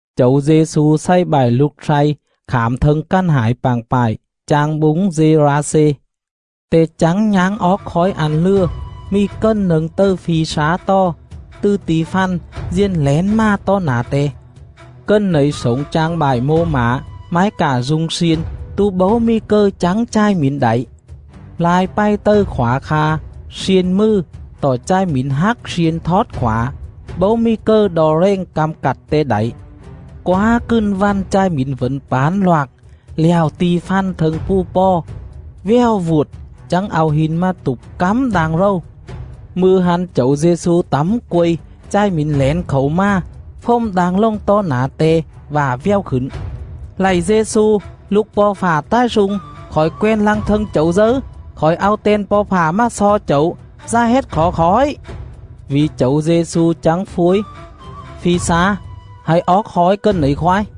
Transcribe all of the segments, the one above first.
Chẩu Dê-xu xày bại lục slay khảm thâng cằn hải pạng pại, chang búng Dê-ra-xê. Te chắng nháng oóc khói ăn lừa, mì cần nâng tầư phi slá tò, tứ ti̱ fằn diền lẻn mà tó nả Te. Cần nẩy slổng chang bại mô mả, mái cạ du̱ng sliên tố bấu mì cầư chắng chài mỉn đảy. Lai pày tầư khỏa kha, sliên mừ, tọ chài mỉn hắc sliên thót khỏa, bấu mì cầư đo rèng căm cặt te đảy. Quá cừn vằn chài mỉn vẩn pản loạc lẹo ti̱ fằn thâng pù pò, vèo vuột, chắng au hin mà tụp cắm đang rầu. Mư̱a hăn Chẩu Dê-xu tẳm quây, chài mỉn lẻn khảu mà, fồm đang lồng tó nả Te vạ vèo khửn: “Lạy Dê-xu, Lục Po̱ Fạ Ta̱i Slung, khỏi quen lăng thâng Chẩu dấư? Khỏi au ten Po̱ Fạ mà xo Chẩu, dá hết khỏ khỏi.” Vỉ Chẩu Dê-xu chắng phuối: “Phi slá, hạy oóc khói cần nẩy khoái.”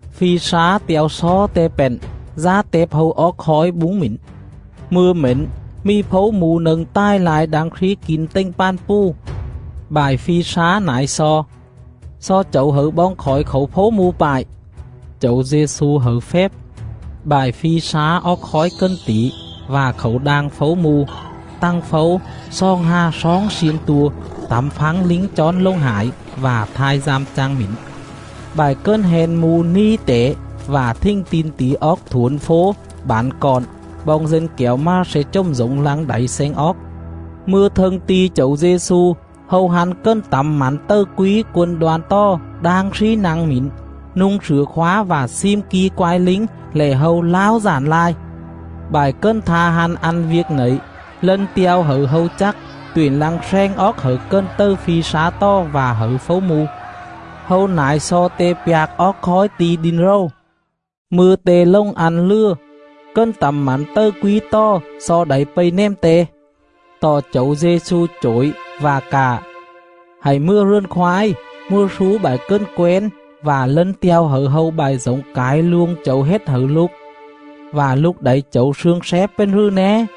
Phi slá te̱o xo Te pện, dá tẹp hâu oóc khói búng mỉn. Mư̱a mển mì phấu mu nâng ta̱i lai đang slí kin tềnh pàn pù. Bại phi slá nải xo: “Xo Chẩu hẩư boong khỏi khảu phấu mu pại.” Chẩu Dê-xu hẩư fép. Bại phi slá oóc khói cần tỉ vạ khảu đang phấu mu. Tằng phấu xoòng hà sloong xiên tua, tẳm phắng lính chón lồng hải vạ thai dăm chang mỉn. Bại cần hen mu ni tẻ vạ thình tin tỉ oóc thuổn fố, bản cọn, boong dân kẻo mà sle chồm dổng lăng đảy sleng oóc. Mư̱a thâng ti̱ Chẩu Dê-xu, hâu hăn cần tẳm mẳn tầư quí “Quân Đoan” tò đang slí nă̱ng mỉn, nu̱ng slửa khóa vạ slim ki quai lính lẻ hâu lao dản lai. Bại cần tha hăn ăn viêc nẩy, lân te̱o hẩư hâu chắc tuyện lăng sleng oóc hẩư cần tầư phi slá tò vạ hẩư phấu mu. Hâu nải xo Te pjạc oóc khói ti̱ đin rầu. Mư̱a Te lồng ăn lừa, cần tẳm mẳn tầư quí tò xo đảy pây nèm Te. Tọ Chẩu Dê-xu chổi vạ cạ: “Hạy mừa rườn khoái, mừa slú bại cần quén vạ lân te̱o hẩư hâu bại dổng cải luông Chẩu hết hẩư lục, vạ lục đảy Chẩu slương slép pền rừ né.”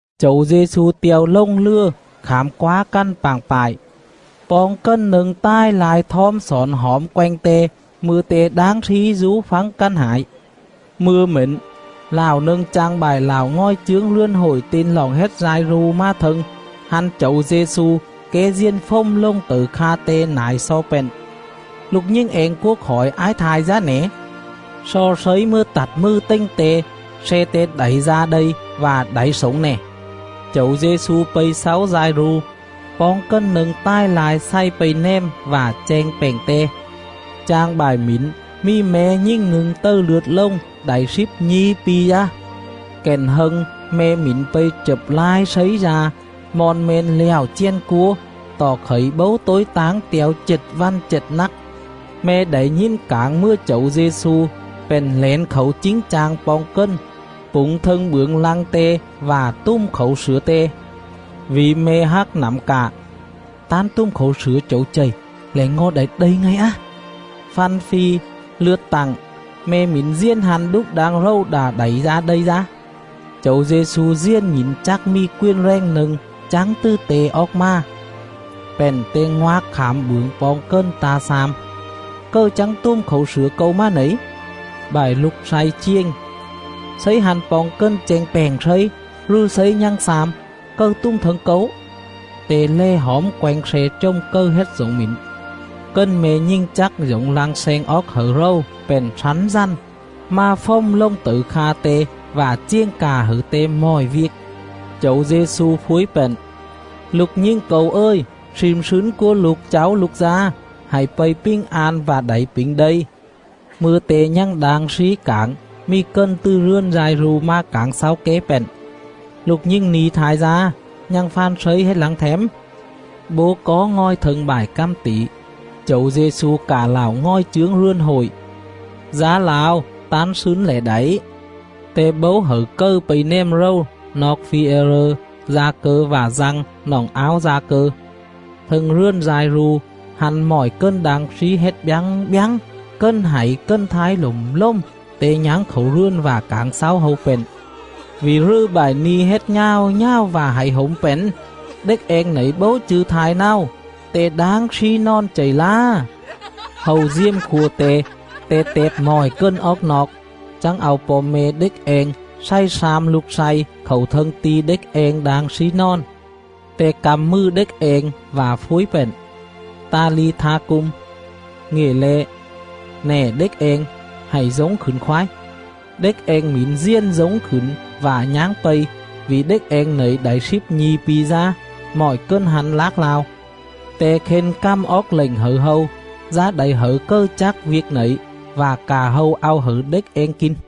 Chẩu Dê-xu te̱o lồng lừa khảm quá cằn pạng pại. Poong cần nâng ta̱i lai thom xỏn hỏm quenh Te mư̱a Te đang slí dú phắng cằn hải. Mư̱a mển, lạo nâng chang bại lạo ngòi chướng rườn hội ten roọng hết Dai-ru mà thâng. Hăn Chẩu Dê-xu, ké diền fồm lồng tẩư kha Te, nải xo pện: “Lục nhình eng cúa khỏi ái thai dá nẻ. Xo Slấy mừa tặt mừ tềnh te, sle te đảy da đây vạ đảy slổng nè.” Chẩu Dê-xu pây xáu Dai-ru. Poong cần nâng ta̱i lai xày pây nèm vạ cheng pẹng Te. Chang bại mỉn mì me̱ nhình nâng tầư lượt lồng đảy slíp nhi̱ pi dá. Cặn hâng me̱ mỉn pây chập lai slấy da, mon me̱n lẹo chèn cúa, tọ khẩy bấu tối táng te̱o chệt vằn chệt nắc. Me̱ đảy nhìn cảng mừa Chẩu Dê-xu, pện lẻn khảu chính chang poong cần, pủng thâng bưởng lăng Te vạ tùm khảu slửa Te. Vỉ me̱ hác nẳm cạ: “Tán tùm khảu slửa Chẩu chầy, lẻ ngo̱ đảy đây ngay á.” Făn fi, lượt tặng. Me̱ mỉn diền hăn đúc đang rầu đạ đảy da đây dá. Chẩu Dê-xu diền nhỉn chắc mì quền rèng nâng chắng tứ Te oóc mà, pện Te ngoạc khảm bưởng poong cần ta xam: “Cầư chắng tùm khảu slửa Câu mà nẩy?” Bại lục slay chiềng: “Slấy hăn poong cần cheng pẹng Slấy, rừ Slấy nhằng xam: ‘Cầư tùm thâng Câu?’” Te lè hỏm quenh sle chồm cầư hết dổng mỉn. Cần me̱ nhình chắc dổng lăng sleng oóc hẩư rầu pện slắn dằn, mà fồm lồng tẩư kha Te vạ chiềng cạ hẩư Te mọi viêc. Chẩu Dê-xu phuối pện: “Lục nhình Câu ời, slim slứn cúa lục cháu lục dá; hạy pây pình an vạ đảy pỉnh đây.” Mư̱a Te nhằng đang slí cảng, mì cần tứ rườn Dai-ru mà cảng xáu ké pện: “Lục nhình ni̱ thai dá, nhằng fàn Slấy hết lăng them?” Bố có ngòi thâng bại cằm tỉ, Chẩu Dê-xu cạ lạo ngòi chướng rườn hội: “Dá lao, tán slứn lẻ đảy.” Te bấu hẩư cầư pây nèm rầu noọc Phi-e-rơ, Da-cơ vạ Dăng, noọng áo Da-cơ. Thâng rườn Dai-ru, hăn mọi cần đang slí hết bjắng bjắng, cần hảy cần thái lộm lồm, Te nháng khảu rườn vạ cảng xáu hâu pện: “Vỉ rừ bại ni̱ hết nhào nhào vạ hảy hổm pện? Đếch eng nẩy bấu chư̱ thai náo, te đang slí nòn chầy lá.” Hâu diềm khua Te. Te tẹp mọi cần oóc noọc, chắng au po̱ me̱ đếch eng xày slam lục slay khảu thâng ti̱ đếch eng đang slí nòn. Te căm mừ đếch eng vạ phuối pện: “Ta-li-tha-cum”; ngịa le̱: “Nè đếch eng, hạy dống khửn khoái.” Đếch eng mỉn diền dống khửn vạ nháng pây, vỉ đếch eng nẩy đảy slíp nhi̱ pi dá. Mọi cần hăn lác lao. Te khên cằm oóc lệnh hẩư hâu, dá đảy hẩư cầư chắc viêc nẩy, vạ cạ hâu au hẩư đếch eng kin.